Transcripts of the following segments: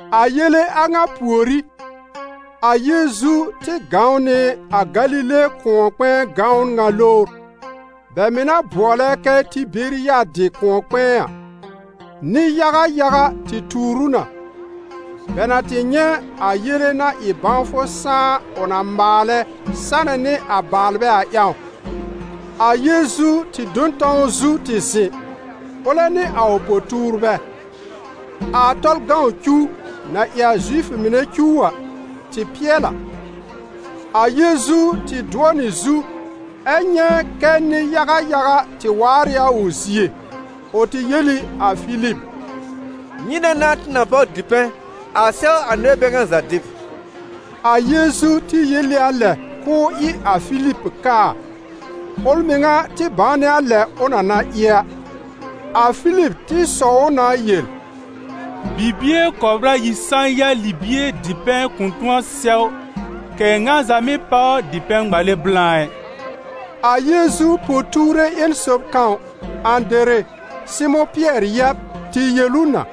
A yele a ŋa pùorí, a Yeezu tɩ gãw nɩ a Galile kʋ̃ɔ-kpɛ̃ɛ gãwn ŋa lowr, bɛ mɩ̀ na bʋɔlɛ kɛ Tɩberiyadɩ kʋ̃ɔ-kpɛ̃ɛ a. Nɩ-yaga yaga tɩ tuur ʋ na, bɛ na tɩ nyɛ̃ a yele-na-ɩ-bãwfʋ-sãá ʋ na maalɛ sanɛ nɩ a baalbɛ a ƴãw. A Yeezu tɩ do n tãw zu tɩ zɩ̃, ʋlɛ nɩ a ʋ po-tuurbɛ. A Tɔlʋ cuw, na ɩ a Zifʋ mɩnɛ cuw a, tɩ pɩɛl a. A Yeezu tɩ dʋɔ nɩ zu, ɛ nyɛ̃ kɛ́ nɩ-yaga yaga tɩ waar ɩ a ʋ zie. Ʋ tɩ yel ɩ a Filib: «Nyɩnɛ n'a tɩ na da dipɛ̃ a sɛw a nɩbɛ bɛ ŋa za dɩb?» A Yeezu tɩ yel ɩ a lɛ k'ʋʋ ɩ a Filib kaa: ʋl mɩŋa tɩ bãw nɩ a lɛ ʋ na na ɩ a. A Filib tɩ sɔw ʋ na yel: «Bibie kɔbr ayi sã-ya libie dipɛ̃ kʋ̃ tʋ̃ɔ sɛw, kɛ̀ ŋa za mɩ́ páw dipɛ̃ ŋmale blã i.» A Yeezu po-tuure ƴẽn sob kãw, Ãdere, Sɩmʋ̃ Pɩɛr yɛb tɩ yel ʋ na: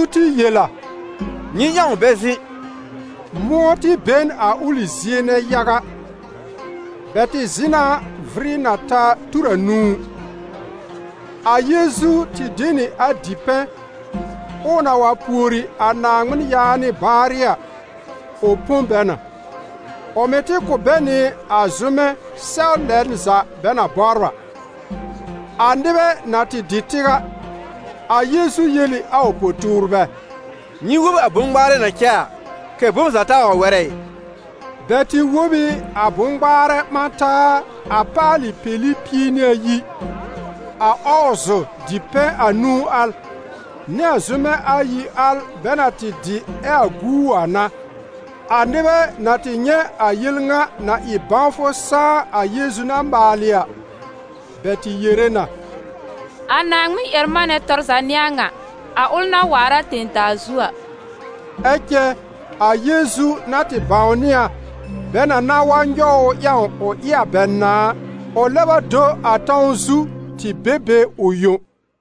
A Yeezu tɩ yel a: «Nyɩ ƴãw bɛ zɩ̃.» Mʋ̃ɔ tɩ be n a ʋlɩ zie nɛ yaga. Bɛ tɩ zɩ̃ na vɩrɩ na ta tur anũu. A Yeezu tɩ de nɩ a dipɛ̃, ɛ ʋ na wa pùori a Naaŋmɩn yaanɩ baarɩ a, ʋ põ bɛ na. Ʋ mɩ̀ tɩ kʋ̀ bɛ nɩ a zʋ́mɛ sɛw lɛn za bɛ na bɔbr a. A nɩbɛ na tɩ dɩ tɩw a, a Yeezu yel ɩ a ʋ po-tuurbɛ: «Nyɩ wob a bʋ̃-ŋmaarɛ na cɛ a, kɛ̀ bom za taa wa wɛrɛ ɩ.» Bɛ tɩ wob ɩ a bʋ̃-ŋmaarɛ ɓã taa a paalɩ peli pie nɩ ayi. A ɔɔzʋ dipɛ̃ anũu al, nɩ a zʋ́mɛ ayi al bɛ na tɩ dɩ ɛ a guu a n'a. A nɩbɛ na tɩ nyɛ̃ a yel ŋa na ɩ bãwfʋ saá a Yeezu na maalɩ a, bɛ tɩ yere na: «A Naaŋmɩn-ƴɛr-manɛ tɔr za n'ɩ a ŋa, a ʋl na waar a tẽ-daa zu a.» Ɛ cɛ a Yeezu na tɩ bãwnɩ a, bɛ na na wa nyɔw ʋ ƴãw ʋ ɩ a bɛ nãà a, ʋ lɛb a do a tãw zu tɩ be be ʋ yõ.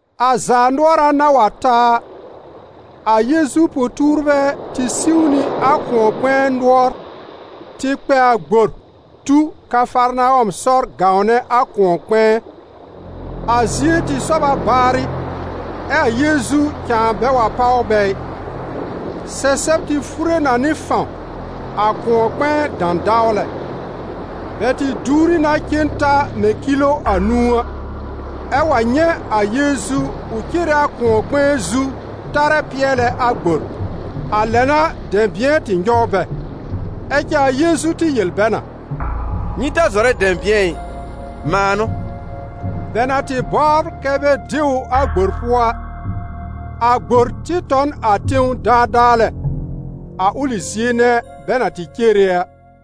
A zaanʋɔra na wa ta a, a Yeezu po-tuurbɛ tɩ siw nɩ a kʋ̃ɔ-kpɛ̃ɛ nʋɔr tɩ kpɛ a gbor tu Kafarnawɔm sɔr gãwnɛ a kʋ̃ɔ-kpɛ̃ɛ. A zie tɩ sɔb a baarɩ, ɛ́ a Yeezu cãa bɛ wa páw bɛ ɩ. Sɛsɛb tɩ fure na nɩ fãw, a kʋ̃ɔ-kpɛ̃ɛ dãdawlɛ. Bɛ tɩ duwri na cen ta mɛ̃ kilo anũu a, ɛ wa nyɛ̃ a Yeezu ʋ cere a kʋ̃ɔ-kpɛ̃ɛ zu tarɛ pɩɛlɛ a gbor. A lɛ n'a dɛ̃bɩ̃ɛ tɩ nyɔw bɛ. Ɛ cɛ a Yeezu tɩ yel bɛ na: «Nyɩ ta zɔrɛ dɛ̃bɩ̃ɛ ɩ, mãa n'ʋ!» Bɛ na tɩ bɔbr kɛ bɛ de ʋ a gbor pʋɔ a, a gbor tɩ tɔ n a tẽw daadaa lɛ, a ʋlɩ zie nɛ bɛ na tɩ cere a.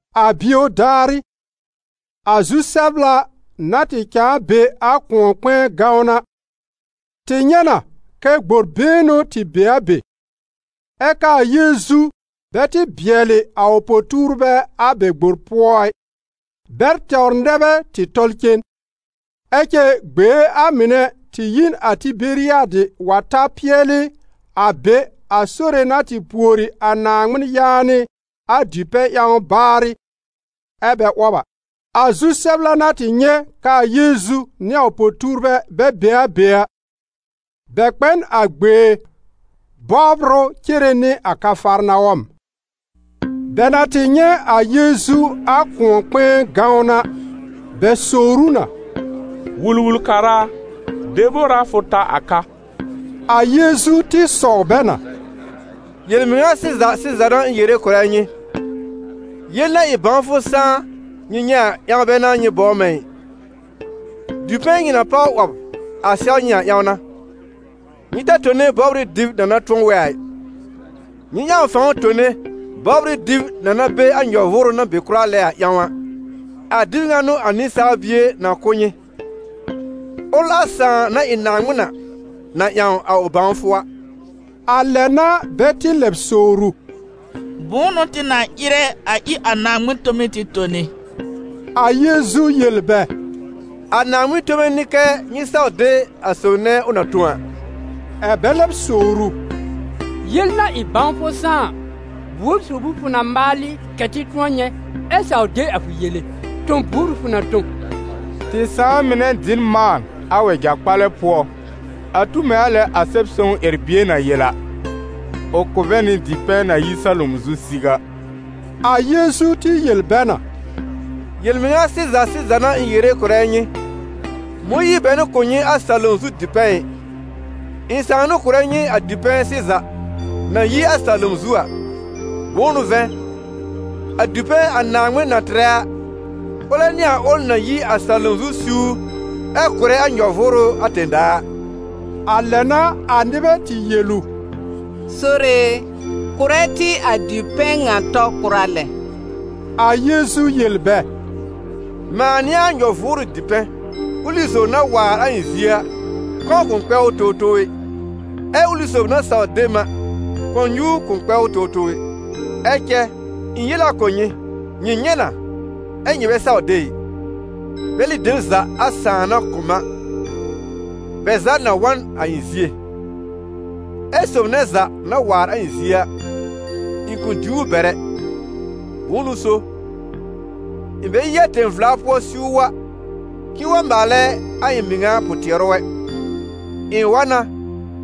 A bio daarɩ, a zu-sɛbla na tɩ cãa be a kʋ̃ɔ-kpɛ̃ɛ gãwn a, tɩ nyɛ̃ na kɛ gbor been n'ʋ tɩ be a be, ɛ k'aa Yeezu bɛ tɩ bɩɛlɩ a ʋ po-tuurbɛ a bɛ gbor pʋɔ ɩ; bɛl tɛwr nɛ bɛ tɩ tɔl cen. Ɛ cɛ gbee a mɩnɛ tɩ yi n a Tɩberiyadɩ wa ta pɩɛlɩ a be a Sore na tɩ pùori a Naaŋmɩn yaanɩ a dipɛ̃ ƴãw baarɩ, ɛ́ bɛ 'wɔb a. A zu-sɛbla na tɩ nyɛ̃ k'aa Yeezu nɩ a ʋ po-tuurbɛ bɛ be a be a, bɛ kpɛ n a gbee bɔbr ʋ cere nɩ a Kafarnawɔm. Bɛ na tɩ nyɛ̃ a Yeezu a kʋ̃ɔ-kpɛ̃ɛ gãwn a, bɛ sowr ʋ na: «Wul-wul-kara a, debor a fʋ ta a ka?» A Yeezu tɩ sɔw bɛ na: «Yel-mɩŋa sɩza sɩza n'a ɩ̃ yere kʋ̀rɛ nyɩ, yel-na-ɩ-bãwfʋ-sãá nyɩ nyɛ̃ a ƴãw bɛ n'a nyɩ bɔbr mɛ̃ ɩ, dipɛ̃ nyɩ na páw 'wɔb sɛw a ƴãw n'a. Nyɩ ta tone bɔbr ɩ dɩb na na tʋ̃ɔ wɛ a ɩ, nyɩ ƴãw fãw tone bɔbr ɩ dɩb na be be a nyɔ-vʋʋrʋ na be kʋra lɛ a ƴãw a, a dɩb ŋa n'ʋ a Nɩsaal Bie na kʋ̀ nyɩ, ʋl a Sãà, na ɩ Naaŋmɩn a, na ƴãw a ʋ bãwfʋ a.» A lɛ n'a bɛ tɩ lɛb sowr ʋ: «Bʋ̃ʋ n'ʋ tɩ na ɩrɛ a ɩ a Naaŋmɩn tome tɩ tone?» A Yeezu yel bɛ: «A Naaŋmɩn tome n'ɩ kɛ́ nyɩ saw de a sob nɛ ʋ na tõ a.» Ɛ̀ bɛ lɛb sowr ʋ: «Yel-na-ɩ-bãwfʋ-sãá-a, buor sob ʋ fʋ na maalɩ kɛ̀ tɩ tʋ̃ɔ nyɛ̃, ɛ saw de a fʋ yele? Tõ-buor ʋ fʋ na tõ? Tɩ sãà mɩnɛ dɩ n mãan a wɛja-kpalɛ pʋɔ, a tu mɛ̃ a lɛ a Sɛb-sõw ƴɛr-bie na yel a: ‹Ʋ kʋ̀ bɛ nɩ dipɛ̃ na yi salom zu siw a.›» A Yeezu tɩ yel bɛ na: «Yel-mɩŋa sɩza sɩza n'a ɩ̃ yere kʋ̀rɛ nyɩ: Mõyiir bɛ n'ʋ kʋ̀ nyɩ a salom zu dipɛ̃ ɩ, ɩ̃ Sãà n'ʋ kʋ̀rɛ nyɩ a dipɛ̃ sɩza na yi a salom zu a. Bʋ̃ʋ n'ʋ vɛ̃, a dipɛ̃ a Naaŋmɩn na tɩrɛ a, ʋlɛ n'ɩ a ʋl na yi a salom zu siwr ɛ kʋ̀rɛ a nyɔ-vʋʋrʋ a tẽ-daa a.» A lɛ n'a a nɩbɛ tɩ yel ʋ: «Sore e, kʋ̀rɛ tɩ a dipɛ̃ ŋa tɔ kʋra lɛ!» A Yeezu yel bɛ: «Mãa n'ɩ a nyɔ-vʋʋrʋ dipɛ̃. Ʋlɩ sob na waar a ɩ̃ zie a, kɔ̃ kʋ̃ kpɛ ʋ towtow ɛ, ɛ ʋlɩ sob na saw de m a, kʋ̃ɔ-nyuur kʋ̃ kpɛ ʋ towtow ɛ. Ɛ cɛ ɩ̃ yel a kʋ̀ nyɩ: nyɩ nyɛ̃ na, ɛ́ nyɩ bɛ saw de ɩ. Bɛlɩ dem za a Sãà na kʋ̀ m a, bɛ za na wa n a ɩ̃ zie; ɛ́ sob nɛ za na waar a ɩ̃ zie a, ɩ̃ kʋ̃ diw ʋ bɛr ɛ. Bʋ̃ʋ n'ʋ so, ɩ̃ bɛ yi a tẽ-vla pʋɔ siw wa k'ɩ̃ɩ wa maalɛ a ɩ̃ mɩŋa pʋ-tɩɛrʋ ɛ, ɩ̃ wa na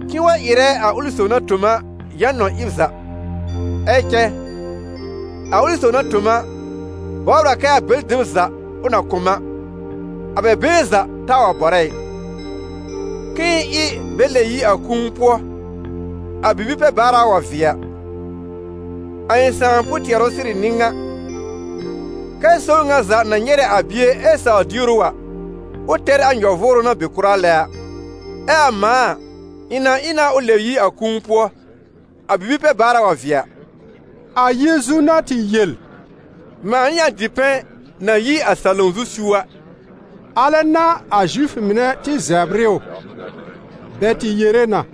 k'ɩ̃ɩ wa ɩrɛ a ʋlɩ sob na tõ m a yã-nɔn ɩb za. Ɛ cɛ a ʋlɩ sob na tõ m a, bɔbr a kɛ a bɛlɩ dem za ʋ na kʋ̀ m a, a bɛ been za taa wa bɔrɛ ɩ, k'ɩ̃ɩ ɩ bɛ lɛb yi a kũu pʋɔ a bibi-pɛ-baara wa vɩɛ a. A ɩ̃ Sãà pʋ-tɩɛrʋ sɩrɩ n'ɩ ŋa: kɛ́ sob ŋa za na nyɛrɛ a Bie ɛ sawr dier ʋ a, ʋ tɛr a nyɔ-vʋʋrʋ na be kʋra lɛ a, ɛ a mãa a, ɩ̃ na ɩ na ʋ lɛb yi a kũu pʋɔ a bibi-pɛ-baara wa vɩɛ a.» A Yeezu na tɩ yel: «Mãa n'ɩ a dipɛ̃ na yi a salom zu siw a», alɛ n'a a Zifʋ mɩnɛ tɩ zɛbr ɩ ʋ. Bɛ tɩ yere na: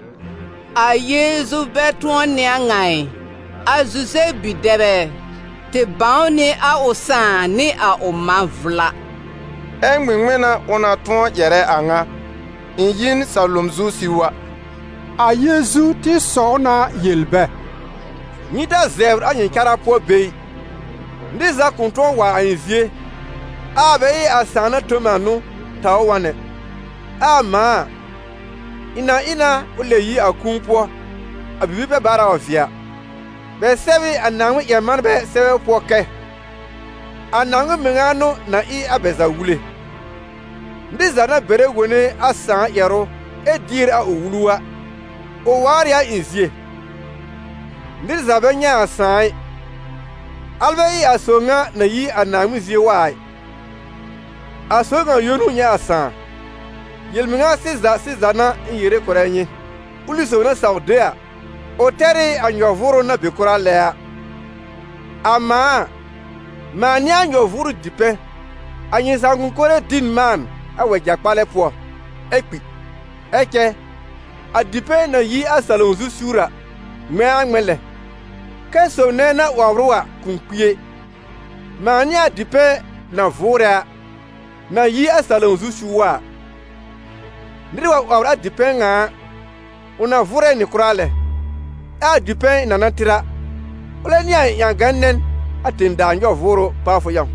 «A Yeezu bɛ tʋ̃ɔ n'ɩ a ŋa ɩ, a Zuzɛb bi-dɛb ɛ? Tɩ bãw nɩ a ʋ sãà nɩ a ʋ mã vla. Ɛ ŋmɩŋmɩn n'a ʋ na tʋ̃ɔ ƴɛrɛ a ŋa: ‹Ɩ̃ yi n salom zu siw wa?›» A Yeezu tɩ sɔw na yel bɛ: «Nyɩ ta zɛbr a nyɩ cara pʋɔ be ɩ. Nɩr za kʋ̃ tʋ̃ɔ wa a ɩ̃ zie, ɛ a bɛ ɩ a Sãà na tõ m a n'ʋ taw ʋ wa n ɛ, ɛ a mãa a, ɩ̃ na ɩ na ʋ lɛb yi a kũu pʋɔ a bibi-pɛ-baara wa vɩɛ a. Bɛ sɛb ɩ a Naaŋmɩn-ƴɛr-manbɛ sɛbɛ pʋɔ kɛ: ‹A Naaŋmɩn mɩŋa n'ʋ na ɩ a bɛ za wule.› Nɩr za na bɛrɛ wone a Sãà ƴɛrʋ ɛ dier a ʋ wulu a, ʋ waar ɩ a ɩ̃ zie. Nɩr za bɛ nyɛ̃ a Sãà ɩ, alɛ bɛ ɩ a sob ŋa na yi a Naaŋmɩn zie wa a ɩ: a sob ŋa yõ n'ʋ nyɛ̃ a Sãà. Yel-mɩŋa sɩza sɩza n'a ɩ̃ yere kʋ̀rɛ nyɩ: ʋlɩ sob na saw de a, ʋ tɛr ɩ a nyɔ-vʋʋrʋ na be kʋra lɛ a. A mãa a, mãa n'ɩ a nyɔ-vʋʋrʋ dipɛ̃. A nyɩ sãakʋm mɩnɛ dɩ n mãan a wɛja-kpalɛ pʋɔ, ɛ kpi. Ɛ cɛ a dipɛ̃, na yi a salom zu siwr a, ŋmɛ̃a ŋmɛ̃ lɛ, kɛ́ sob nɛ na 'wɔbr ʋ a kʋ̃ kpi ɛ. Mãa n'ɩ a dipɛ̃ na vʋʋrɛ a, na yi a salom zu siw wa a. Nɩr wa 'wɔbr a dipɛ̃ ŋa a, ʋ na vʋʋrɛ nɩ kʋra lɛ, ɛ a dipɛ̃ ɩ̃ na na tɩr a, ʋlɛ n'ɩ a ɩ̃ ƴãgã-nɛn a tẽ-daa nyɔ-vʋʋrʋ pawfʋ ƴãw.»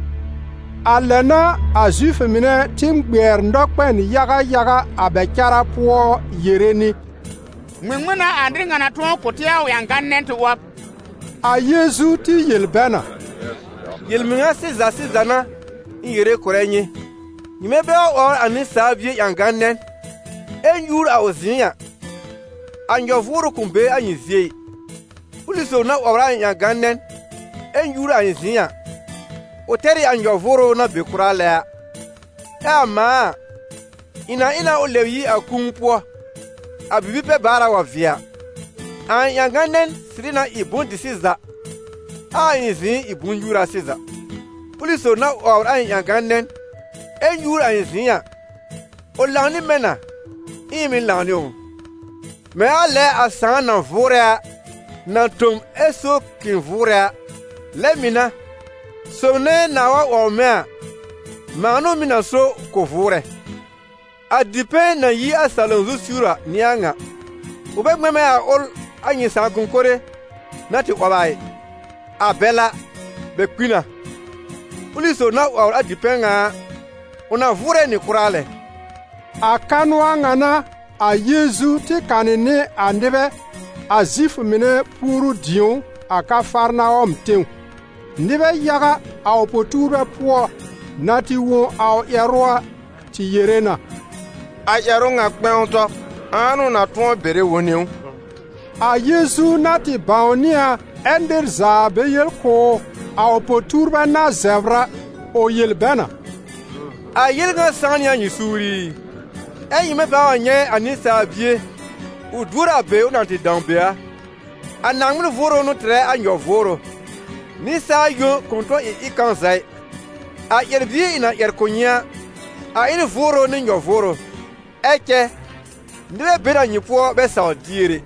A lɛ n'a a Zifʋ mɩnɛ tɩ ŋmɩɛr nɔkpɛn yaga yaga a bɛ cara pʋɔ yere nɩ: «Ŋmɩŋmɩn n'a a nɩr ŋa na tʋ̃ɔ kʋ̀ tɩ a ʋ ƴãgã-nɛn tɩ 'wɔb?» A Yeezu tɩ yel bɛ na: «Yel-mɩŋa sɩza sɩza n'a ɩ̃ yere kʋ̀rɛ nyɩ: nyɩmɛ bɛ wa 'wɔbr a Nɩsaal Bie ƴãgã-nɛn, ɛ nyúur a ʋ zɩ̃ɩ a, a nyɔ-vʋʋrʋ kʋ̃ be a nyɩ zie ɩ. Ʋlɩ sob na 'wɔbr a ɩ̃ ƴãgan-nɛn ɛ nyúur a ɩ̃ zɩ̃ɩ a, ʋ tɛr ɩ a nyɔ-vʋʋrʋ na be kʋra lɛ a, ɛ a mãa a, ɩ̃ na ɩ na ʋ lɛb yi a kũu pʋɔ a bibi-pɛ-baara wa vɩɛ a. A ɩ̃ ƴãgã-nɛn sɩrɩ na ɩ bʋ̃-dɩ-sɩza, ɛ a ɩ̃ zɩ̃ɩ ɩ bʋ̃-nyúura sɩza. Ʋlɩ sob na 'wɔbr a ɩ̃ ƴãgã-nɛn ɛ nyúur a ɩ̃ zɩ̃ɩ a, ʋ lãw nɩ mɛ̃ na, ɛ ɩ̃ mɩ̀ lãw nɩ ʋ. Mɛ̃ a lɛ a Sãà na vʋʋrɛ a, na tõ m ɛ so k'ɩ̃ɩ vʋʋrɛ a, lɛ mɩ̀ n'a, sob nɛ nãá wa 'wɔbr mɛ̃ a, mãa n'ʋ mɩ̀ na so k'ʋ vʋʋrɛ. A dipɛ̃ na yi a salom zu siwr a n'ɩ a ŋa. Ʋ bɛ ŋmɛ̃ mɛ̃ a ʋl a nyɩ sãakʋm mɩnɛ na tɩ 'wɔb a ɩ, a bɛl a, bɛ kpi na. Ʋlɩ sob na 'wɔbr a dipɛ̃ ŋa a, ʋ na vʋʋrɛ nɩ kʋra lɛ.» A kanʋ a ŋa n'a a Yeezu tɩ kanɩ nɩ a nɩbɛ a Zifʋ mɩnɛ puoru-dĩ̀ó a Kafarnawɔm tẽw. Nɩbɛ yaga, a ʋ po-tuurbɛ pʋɔ, na tɩ wõ a ʋ ƴɛrʋ a, tɩ yere na: «A ƴɛrʋ ŋa kpɛ̃w tɔ, ãa n'ʋ na tʋ̃ɔ bɛrɛ wone ʋ?» A Yeezu na tɩ bãwnɩ a, ɛ nɩr za bɛ yel kʋ̀ ʋ, a ʋ po-tuurbɛ na zɛbr a, ʋ yel bɛ na: «A yel ŋa sãw nɩ a nyɩ suur ɩ? Ɛ nyɩmɛ pãa wa nyɛ̃ a Nɩsaal Bie ʋ duor a be ʋ na tɩ dãw be a? A Naaŋmɩn Vʋʋrʋ n'ʋ tɩrɛ a nyɔ-vʋʋrʋ, nɩsaal yõ kʋ̃ tʋ̃ɔ ɩ ɩb kãw za ɩ. A ƴɛr-bie ɩ̃ na ƴɛr kʋ̀ nyɩ a, a ɩ n Vʋʋrʋ nɩ nyɔ-vʋʋrʋ. Ɛ cɛ nɩbɛ be n a nyɩ pʋɔ bɛ sawr dier ɛ.»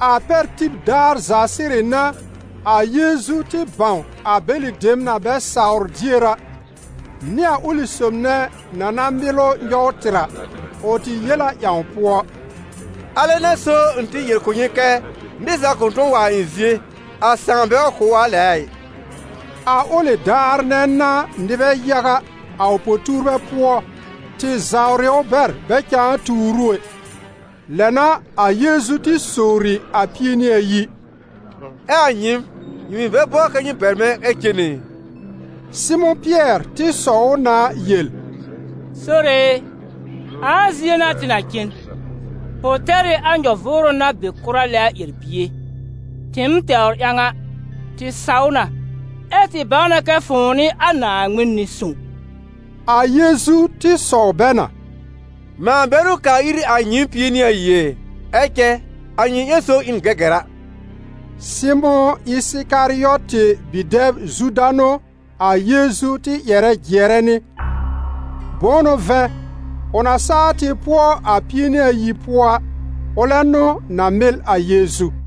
A pɛr tib daar za sɩrɩ n'a, a Yeezu tɩ bãw a bɛlɩ dem na bɛ sawr dier a, nɩ a ʋlɩ sob nɛ na na mɩl ʋ nyɔw tɩr a. Ʋ tɩ yel a ƴãw pʋɔ: «Alɛ n'a so, ɩ̃ tɩ yel kʋ̀ nyɩ kɛ́ nɩr za kʋ̃ tʋ̃ɔ wa a ɩ̃ zie, a Sãà bɛ wa kʋ̀ ʋ a lɛ a ɩ.» A ʋlɩ daar nɛ n'a nɩbɛ yaga, a ʋ po-tuurbɛ pʋɔ, tɩ zawr ʋ bɛr bɛ cãa tuur ʋ ɛ. Lɛ n'a a Yeezu tɩ sowri a Pie- nɩ-ayi: «Ɛ a nyɩɩm, nyɩ mɩ̀ bɛ bɔbr kɛ nyɩ bɛr mɛ̃ ɛ cen ɛ?» Sɩmʋ̃ Pɩɛr tɩ sɔw ʋ na yel: «Sore e, ãa zie n'a tɩ na cen? Fʋ tɛr ɩ a nyɔ-vʋʋrʋ na be kʋra lɛ a ƴɛr-bie. Tɩɩm tɛwr ƴãw a, tɩ saw na, ɛ tɩ bãw na kɛ fʋ̃ʋ n'ɩ a Naaŋmɩn Nɩ-sõw.» A Yeezu tɩ sɔw bɛ na: «Mãa bɛ n'ʋ kaa ir a nyɩɩm Pie-nɩ-ayi ɛ? Ɛ cɛ a nyɩ ƴẽn sob ɩ n gɛgɛra.» Sɩmʋ̃ Ɩsɩkarɩɔtɩ bi-dɛb Zuda n'ʋ a Yeezu tɩ ƴɛrɛ jɩɛrɛ nɩ. Bʋ̃ʋ n'ʋ vɛ̃, ʋ na saa tɩ pʋɔ a Pie-nɩ-ayi pʋɔ a, ʋlɛ n'ʋ na mɩl a Yeezu.